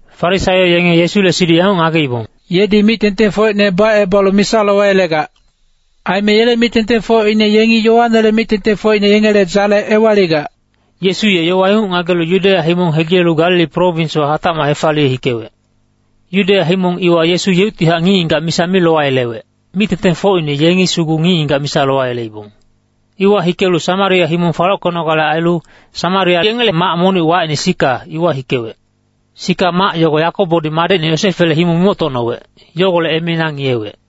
Farisaio yenge Yesule siduc yanguc ngageibong, “Yedi mic-tengtengfocine bacebalu misa lowayelegac. Aime yele mic-tengtengfocine yengi Yoanele mic-tengtengfocine yengele dzale ewaligac.” Yesu ye yowa inguc ngagelu Yudeya himong hegilelu Galili prowinswa hatacmac hefaliye hikewec. Yudeya himong iwa Yesu yeuctihac ngic-ngigac misa mi lowayelewec, mic-tengtengfocine yengi sugu ngic-ngigac misa lowayeleibong. Iwa hikelu Samaria himong falockenogale ailu, Samaria yengele mac monic wacine Sika, iwa hikewec. Sika mac yogo Yakobodi madecine Yosefele himong mimoctocnowec, yogolec emeina ngiyewec.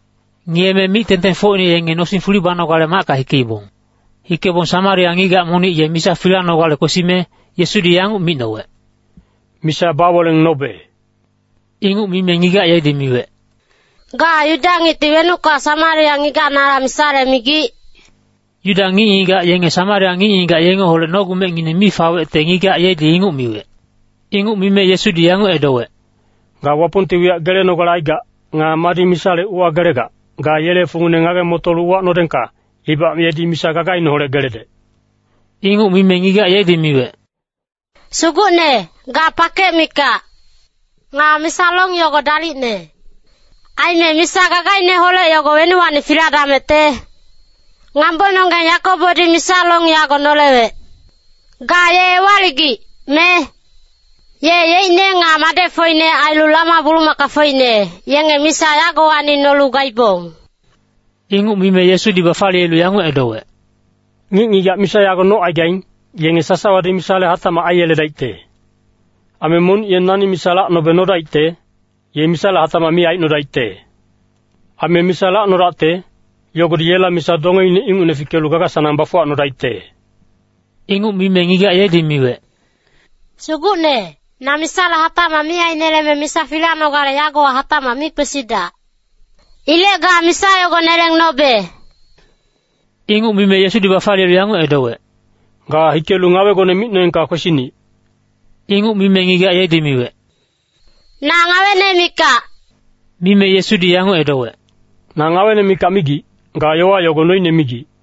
Ngiyeme mic-tengtengfocine yenge nosing fuli banogale macka hikeibong. Hikebong Samaria ngigac monic ye misa filanogale kwesime, Yesudi yanguc micnowec, “Misa baweleng nobe.” Inguc mime ngigac yedi miwec, “Ga Yuda ngicti wenucka Samaria ngigac nala misale migic?” Yuda ngic-ngigac yenge Samaria ngic-ngigac yengeholec nogumecngineng mi fawecte ngigac yedi inguc miwec. Inguc mime Yesudi yanguc edowec, “Ga Wapongti wiyac gelenogale aigac, nga madi misale uwagelegac, ga yele fungine ngage-motolu uwacnodengka, ibac yedi misa gagaineholec geledec.” Inguc mime ngigac yedi miwec, “Sugucne, ga pakec mikac. Nga misa long yogo dalicne. Aime misa gagaineholec yogo wenuwacni filadamecte? Ngambononggeng Yakobodi misa long yago nolewec. Ga ye ewaligic, me? Ye yeicne nga madecfocine ailu lama-bulumakafocine, yenge misa yagowacni nolu gaibong.” Inguc mime Yesudi bafaliyelu yanguc edowec, “Ngic-ngigac misa yago nocaigaing, yenge sasawadi misale hatacmac aiyeledaicte. Aime monic ye nani misa lacnobe nodaicte, ye misale hatacmac mi aicnodaicte. Aime misa lacnodacte, yogodi yela misa dongeine ingucne fikelu gaga-sanang bafuwacnodaicte.” Inguc mime ngigac yedi miwec, “Sugucne, na misale hatacmac mi aineleme misa filanogale yagowa hatacmac mi kwesidac. Ilec ga misa yogo neleng nobe.” Inguc mime Yesudi bafaliyelu yanguc edowec, “Ga hikelu ngawegone micnoengka kwesinic.” Inguc mime ngigac yedi miwec, “Na ngawene mikac.” Mime Yesudi yanguc edowec, “Na ngawene mikac migic, ga yowa yogo noine migic.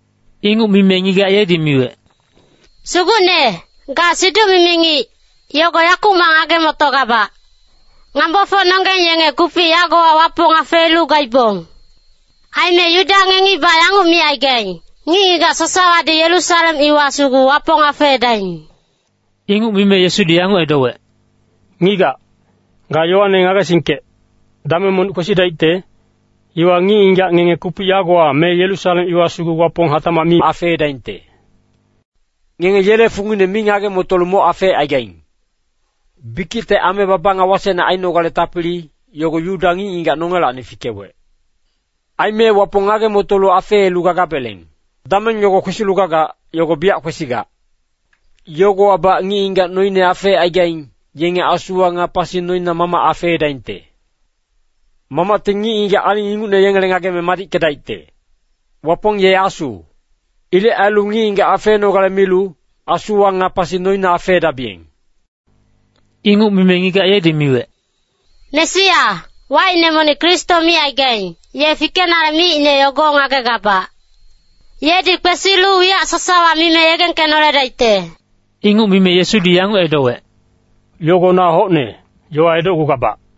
Inguc mime ngigac yedi miwec, “Sugucne, ga siduc-mimi ngic, yogo yakumac ngage-motogabac. Ngambofocnonggeng yenge kupic yagowa Wapong afeelu gaibong. Aime Yuda ngengibac yanguc micaigaing, ‘Ngic-ngigac sasawadi Yerusalem iwa sugu Wapong afeedaing.’” Inguc mime Yesudi yanguc edowec, “Ngigac, ga yowane ngagesingkec, dameng monic kwesidaicte, iwa ngic-ngigac ngenge kupic yagowa me Yerusalem iwa sugu Wapong hatacmac mi afeedaingte. Ngenge yele fungine mi ngage-motolu moc afeecaigaing. Bikicte ame baba nga wasecne ainogale tapili, yogo Yuda ngic-ngigac nongelacni fikewec. Aime Wapong ngage-motolu afeelu gagabeleng. “Dameng yogo kwesilu gagac, yogo biyac kwesigac. Yogowabac ngic-ngigac noine afecaigaing, yenge asuwa nga pasi noina Mamac afeedaingte. Mamacti ngic-ngigac aling ingucne yengele ngageme madickedaicte. Wapong ye Asu. Ilec ailu ngic-ngigac afeenogale milu, asuwa nga pasi noina afeedabiyeng.” Inguc mime ngigac yedi miwec, “Mesia, wacine monic Kristo micaigaing, ye fikenale miicne yogo ngagegabac. Yedi kwesilu wiyac sasawa mime yegengkenoledaicte.” Inguc mime Yesudi yanguc edowec, “Yogo na hocne yowa edocgugabac.”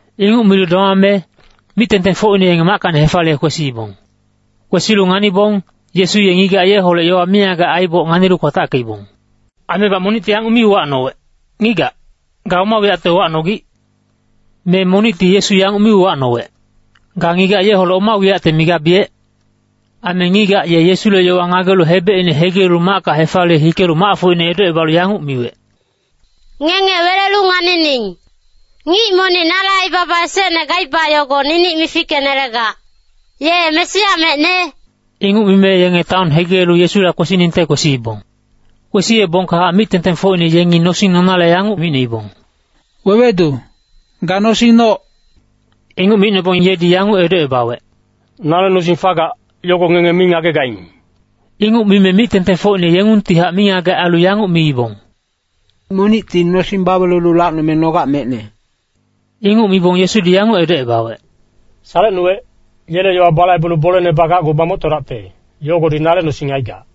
Inguc milu domame, mic-tengtengfocine yenge mackacni hefaliye kwesiibong. Kwesilu nganibong, Yesu ye ngigac yeholec yowa mingagec aiboc nganilu kwatackeibong. Aimebac monicti yanguc mi uwacnowec, “Ngigac, ga oma wiyacte uwacnogic?” Me monicti Yesu yanguc mi uwacnowec “Ga ngigac yeholec oma wiyacte migabiyec?” Aime ngigac ye Yesule yowa ngagelu hebecine hegilelu macka hefaliye hikelu macfocine edocebalu yanguc miwec, “Ngenge welelu nganining. Ngic monic nale aibaba esecne gaiba yogo ninic mifickenelegac. Ye Mesia mecne?” Inguc mime yenge taon hegilelu Yesula kwesiningte kwesiibong. Kwesiyebongkahac mic-tengtengfocine yengi nosing nonale yanguc micnoibong, “Wewedu, ga nosing noc.” Inguc micnobong yedi yanguc edocebawec, “Nale nosing fagac, yogo ngenge mi ngagegaing.” Inguc mime mic-tengtengfocine yengungtihac mingagec ailu yanguc miibong, “Monicti nosing bawelelu lacnome nogac mecne.” Inguc mibong Yesudi yanguc edocebawec, “Salecnuwec, yele yowa balaibelu boleine bagacgu bamoctodacte, yogodi nale nosing aigac.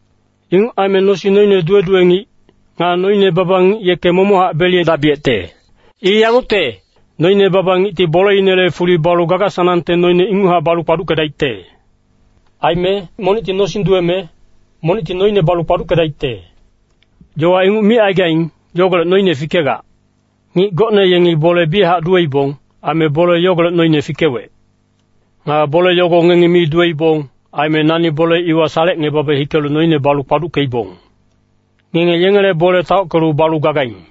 Inguc aime nosing noine duwe-duwe ngic, nga noine baba ngic yeke momochac beliyedabiyecte. I yangucte, noine baba ngicti boleinele fuli balu gaga-sanangte noine inguchac balu kpaduckedaicte. “Aime, ‘Monicti nosing duweme, monicti noine balu kpaduckedaicte.’ Yowa inguc micaigaing, yogolec noine fikegac. Ngic gocne yengi bole biyachac duweibong. Aime bole yogolec noine fikewec. Nga bole yogo ngengi mi duweibong. Aime nani bole iwa salecngebabe hikelu noine balu kpaduckeibong. Ngenge yengele bole taockelu balu gagaing.”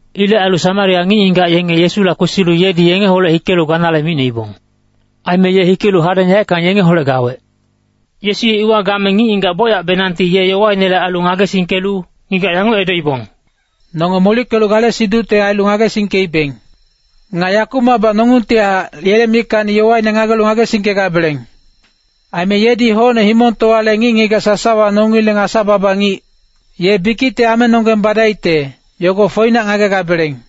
Ilec ailu Samaria ngic-ngigac yenge Yesula kwesilu yedi yengeholec hikelu ganale micnoibong. Aime ye hikelu hadeng yaeckang yengeholec gawec. Yesu ye iwa game ngic-ngigac bocyacbenangti ye yowainele ailu ngagesingkelu ngigac yanguc edoibong, “Nonge molickelu gale siducte ailu ngagesingkeibeng. Nga yakumacbac nongungtihac yele mickacni yowaine ngagelu ngagesingkegabeleng. Aime yedi hocne himongtowale ngic-ngigac sasawa nongileng Asa-baba ngic. Ye bikicte amenonggeng badaicte, yogo foinac ngagegabeleng.”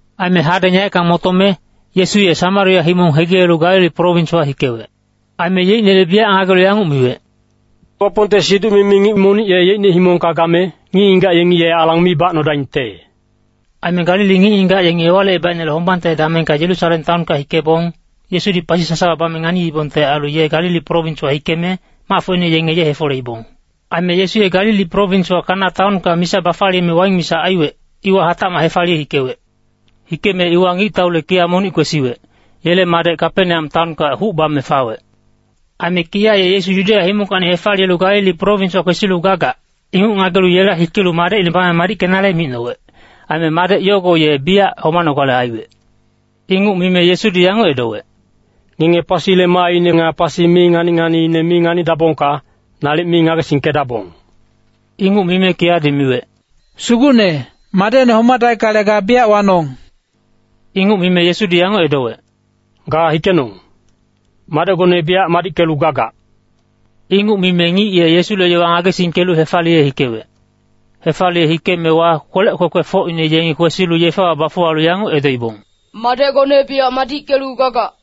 Aime hadeng yaeckang motome, Yesu ye Samaria himong hegilelu Galili prowinswa hikewec. Aime yeicnele biyac ngagelu yanguc miwec, “Wapongte siduc-mimi ngic monic ye yeicne himongka game, ngic-ngigac yenge ye alang mi bacnodaingte.” Aime Galili ngic-ngigac yenge Ewalicebaicnele hombangte damengka Yerusalem taonka hikebong, Yesudi pasi sasawa bame nganiibongte ailu ye Galili prowinswa hikeme, macfocine yenge ye hefoleibong. Aime Yesu ye Galili prowinswa Kana taonka misa bafaliyeme waing misa aiwec, iwa hatacmac hefaliye hikewec. Hikeme iwa ngictaule kiya monic kwesiwec, yele madec Kapeneam taonka huc bame fawec. Aime kiya ye Yesu Yudeya himongkacni hefaliyelu Galili prowinswa kwesilu gagac, inguc ngagelu yela hikelu madecine bame madickenale micnowec. Aime madec yogo ye biyac homanogale aiwec. Inguc mime Yesudi yanguc edowec, “Ngenge pasile maaine nga pasi mi ngani-nganiine mi nganidabongka, nalic mi ngagesingkedabong.” Inguc mime kiyadi miwec, “Sugucne, madecne homadaickale ga biyac wanong.” Inguc mime Yesudi yanguc edowec, “Ga hikenong. Madecgone biyac madickelu gagac.” Inguc mime ngic ye Yesule yowa ngagesingkelu hefaliye hikewec. Hefaliye hikeemewa, kwelec kwekwefocine yengi kwesilu yefewa bafuwalu yanguc edoibong, “Madecgone biyac madickelu gagac.”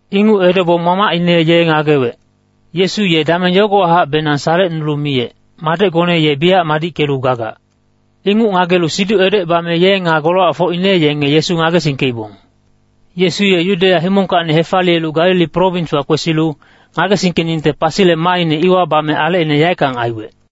Inguc edobong mamacine ye ngagewec, “Yesu ye dameng yogowahacbenang salecnulu miyec, ‘Madecgone ye biyac madickelu gagac.’” Inguc ngagelu siduc edocebame ye nga golowacfocine yenge Yesu ngagesingkeibong. Yesu ye Yudeya himongkacni hefaliyelu Galili prowinswa kwesilu, ngagesingkeningte pasile maaine iwa bame alecine yaeckang aiwec.